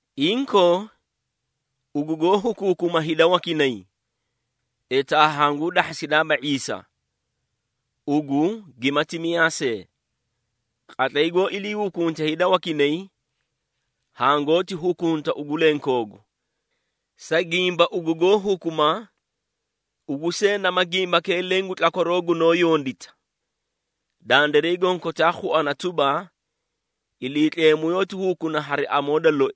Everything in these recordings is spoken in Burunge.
Inkoo, ugu goó hukuukuma hida wakinay, etaa hanguu dahhasidaaba ⁄iisa, ugu gimati miyaa see. Qatlay goó ilii hukunte hida wakinay, hangoóti hukunta ugu lenkoogu, sa gimba ugu goó hukuma, ugu see nama gimbakee leẽ gu tlakwaroo gunoó yondita. Dandiray gonkotaa khuana tuba, Iliitleemu yoóti hukuna hari amoo da loi,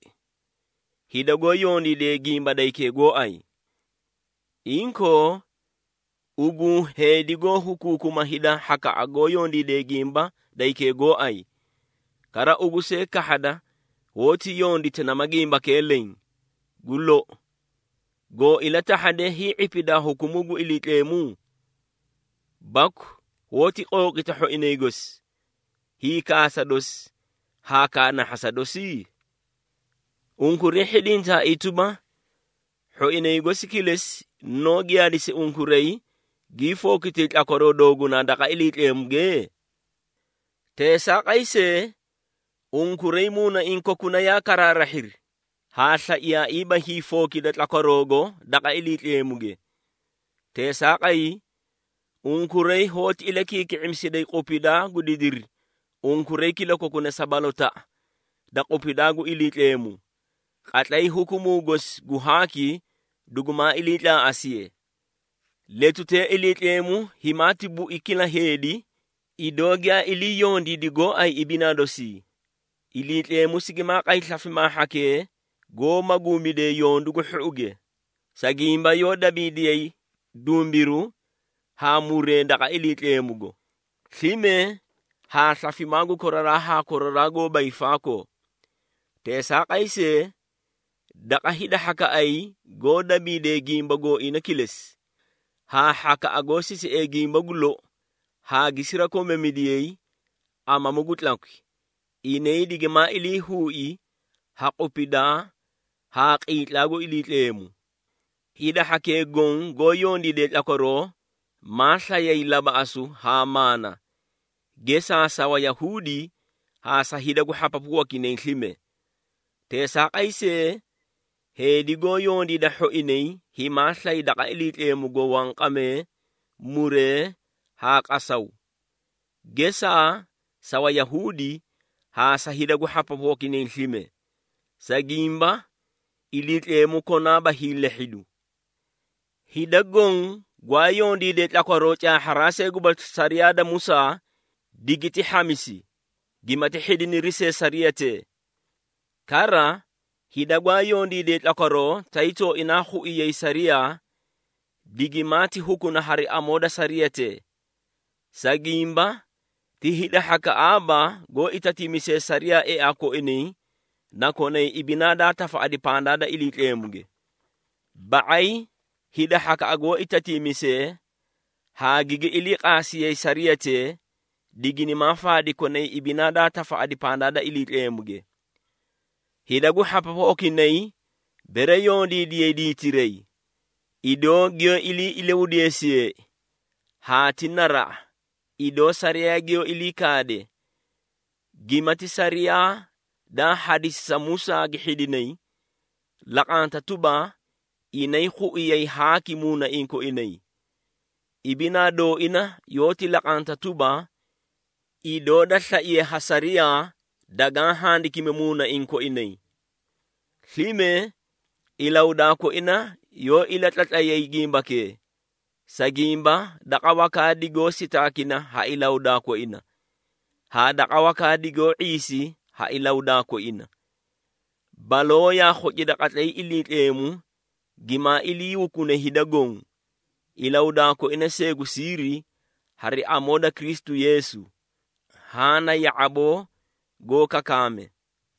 hida goó yondiidee gimba da hikee gooay. Inkoo, ugu heedi goó hukuukuma hida hhakaꞌa goó yondiidee gimba da hikee gooay, kara ugu see kahhada hoóti yondita nama gimbakee leẽ! Gu lou, goo ilatahhade hii⁄ipidaa hukumuu gu Iliitleemu? Baku hoóti qooqita hhoinay gosi, hiikaasa dosi haa kaanahhasa dosi? Unkuray hhidintaaii tuba, hhoinay gosi kilesi, noó giyaadisi unkuray gii fookitay tlakwaroo doogunaa daqa Iliitleemuge? Teesaaqay see, unkuray muunaiĩ kokuna yaa karaarahhiri haa slaiyaaiiba hiifookida tlakwaroogo daqa Iliitleemuge. Teesaaqay, unkuray hoóti ilakiiki⁄imisiday qupidaa gu didiri unkuray kilakokuna sa balotaꞌa da qupidaa gu Iliitleemu, qatlay hukumuu gosi gu haaki dugumaa iliitlaaꞌasiye. Letutee Iliitleemu himaati bui kila heedi, idoo giyaa ilii yondiidi gooay ibinaa dosii. Iliitleemu sigimaa qay slafimaa hhakee goó maguumidee yondu gu hhouge, sa gimba yoó dabiidiyay dumbiru haa muree daqa Iliitleemugo, slime haa slafimaa gu koraraa haa koraraa goóba hiifaakoo. Teesaaqay see, daqa hida hhakaꞌay goó dabiidee gimba gooina kilesi, haa hhakaꞌa goó sisiee gimba gu lou haa gi sirakomamidiyay amamu gu tlakwi, inay digimaa ilii huui ha qupidaa haa qiitlaa gu Iliitleemu. Hida hhakee goõ goó yondiide tlakwaroo, maa slayay labaꞌasu haa maana, gesaa sa Wayahuudi haa sa hida gu hhapapu wakinay slime. Teesaaqay see, heedi goó yondiida hhoinay himaa slay daqa Iliitleemugo wanqamee, muree haa qasaw. Gesaa sa Wayahuudi haa sa hida gu hhapapu wakinay slime. Sa gimba, Iliitleemu konaaba hiilehhidu. Hida goõ gwaa yondiidee tlakwaroo caahharaa see gubasli sariyaa da Musaa digiti hhamisi gimati hhidiniri see sariyatee. Kara, hida gwaa yondiidee tlakwaroo, tay tooina khuiyay sariyaa, digimaati hukuna hari amoo da sariyatee. Sa gimba, ti hida hhakaꞌaaba goó itatiimisee sariyaa eaa koinay na konay ibinaa daa tafaꞌadi pandaa da Iliitleemuge. Ba⁄ay hida hhakaꞌa goó itatiimisee haa gigi iliiqaasiyay sariyatee diginimaa faadi konay ibinaa daa tafaꞌadi pandaa da Iliitleemuge. Hida gu hhapapu wakinay bere yondiidiyay diitiray, idoo giyoó ilii ilahudeesiyeei, haa ti naraꞌa idoo sariyaa giyoó ilii kaade, gimati sariyaa daa hadisi sa Musaa gi hhidinay, laqanta tuba, inay khuiyay haaki muunaiĩ koinay. Ibinaa dooina yoóti laqanta tuba, idoo da slaiye ha sariyaa dagaã handikimi muunaiĩ koinay. Slime ilahudaa koina yoó ilatlatlay gimbakee, sa gimba daqa wakaa digoó sitaakina ha ilahudaa koina, haa daqa wakaa digoó ⁄iisi ha ilahudaa koina. Baloo yaa khocida qatlay Iliitleemu gimaa ilii hukune hida goõ, ilahudaa koina see gu siiri, hari amoo da Kristu Yeesu. Haã na ya⁄aboo goó kakaakame.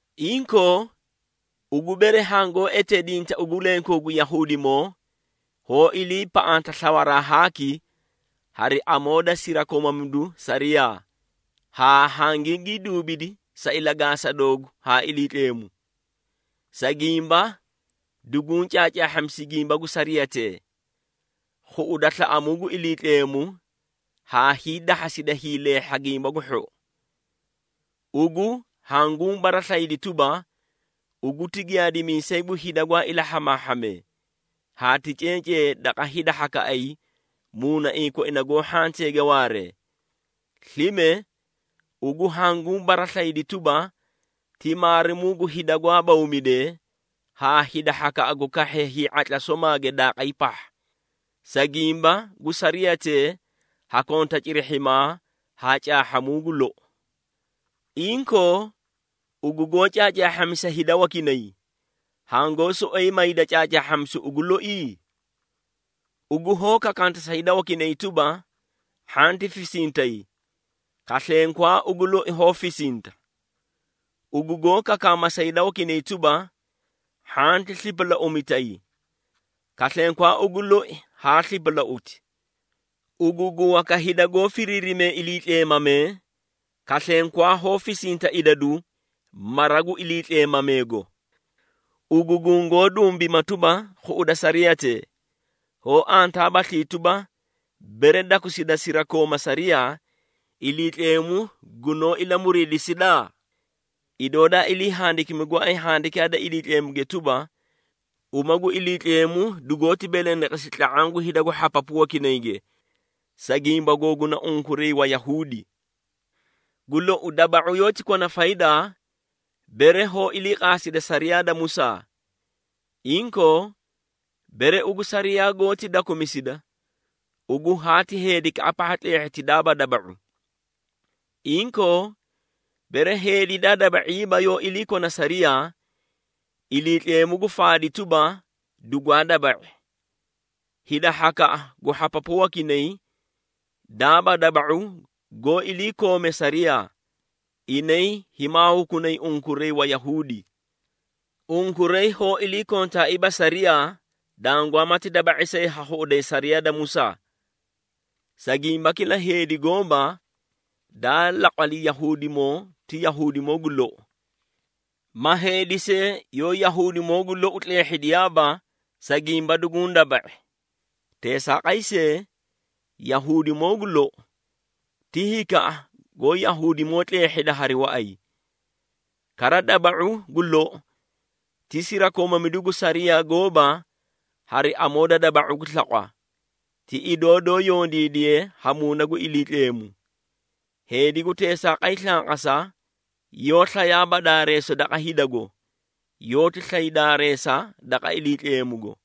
Inkoo, ugu bere hangoó eteedinta ugu lenkoogu Yahuudimoo, hoó iliipaꞌanta slawaraa haaki hari amoo da sirakomamidu sariyaa, haa hangigii duubidi sa ilagaasa doogu haa Iliitleemu. Sa gimba duguũ caacaahhamisi gimba gu sariyatee, khuꞌuda slaꞌamuu gu Iliitleemu haa hiidahhasida hiileehha gimba gu hhou. Ugu hanguũ baraslayidi tuba, ugu ti giyaadimiisay gu hida gwaa ilahhamaahhamee, haa ti cencee daqa hida hhakaꞌay muunaiĩ koina goó hhanteege waaree. Slime, ugu hanguũ baraslayidi tuba, ti maarimuu gu hida gwaa bawmidee haa hida hhakaꞌa gu kahhee hii⁄atla somaage daaqay pahha, sa gimba gu sariyatee ha konta cirihhimaa haa caahhamuu gu lou. Inkoo, ugu goó caacaahhamisa hida wakinay, hangoó soꞌoyi mayda caacaahhamisu ugu loi? Ugu hoó kakaanta sa hida wakinay tuba, hhanti fisintay, kaslenkwaa ugu loi hoó fisinta. Ugu goó kakaama sa hida wakinay tuba, “Hhanti slipalauumitay,” kaslenkwaa ugu loi haa slipalauti. Ugu gu waka hida goó firiirimee iliitleemamee, kaslenkwaa hoó fisinta idadu mara gu iliitleemameego. Ugu gungoó dumbima tuba, khuꞌuda sariyatee, hoó antaabaslii tuba, bere dakusida sirakooma sariyaa, Iliitleemu gunoó ilamuriidisida? Idoo daa ilii handikimi gooay Handikaa da Iliitleemuge tuba, “Uma gu Iliitleemu dugoóti belendeqesi tla⁄aã gu hida gu hhapapu wakinayge, sa gimba googuna unkuray Wayahuudi.” Gu lou, daba⁄u yoóti kona faydaa, bere hoó iliiqaasida sariyaa da Musaa. Inkoo, bere ugu sariyaa goóti dakumisida, ugu haati heedikaꞌa pahha tleehhiti daaba daba⁄u. Inkoo, bere heedi daa daba⁄iiba yoó ilakona sariyaa, Iliitleemu gu faadi tuba, dugwaa daba⁄i. Hida hhakaꞌa gu hhapapu wakinay, daaba daba⁄u goó iliikoomee sariyaa, inay himaa hukunay unkuray Wayahuudi. Unkuray hoó iliikontaaiiba sariyaa, dangwaamati daba⁄i see haa khuꞌuday sariyaa da Musaa. Sa gimba kila heedi gooba, daa laqwali Yahuudimoo ti Yahuudimoo gu lou, ma heedi see yoó Yahuudimoo gu lou tleehhidiyaaba, sa gimba duguũ daba⁄i. Teesaaqay see, Yahuudimoo gu lou, ti hikaꞌa goó Yahuudimoo tleehhida hari waꞌay. Kara daba⁄u gu lou, ti sirakomamidu gu sariyaa gooba hari amoo da daba⁄u gu slaqwa, ti idoo doó yondiidiye ha Muuna gu Iliitleemu. Heedi gu teesaaqay slanqasa yoó slayaaba daareesa daqa hidago, yoóti slay daareesa daqa Iliitleemugo.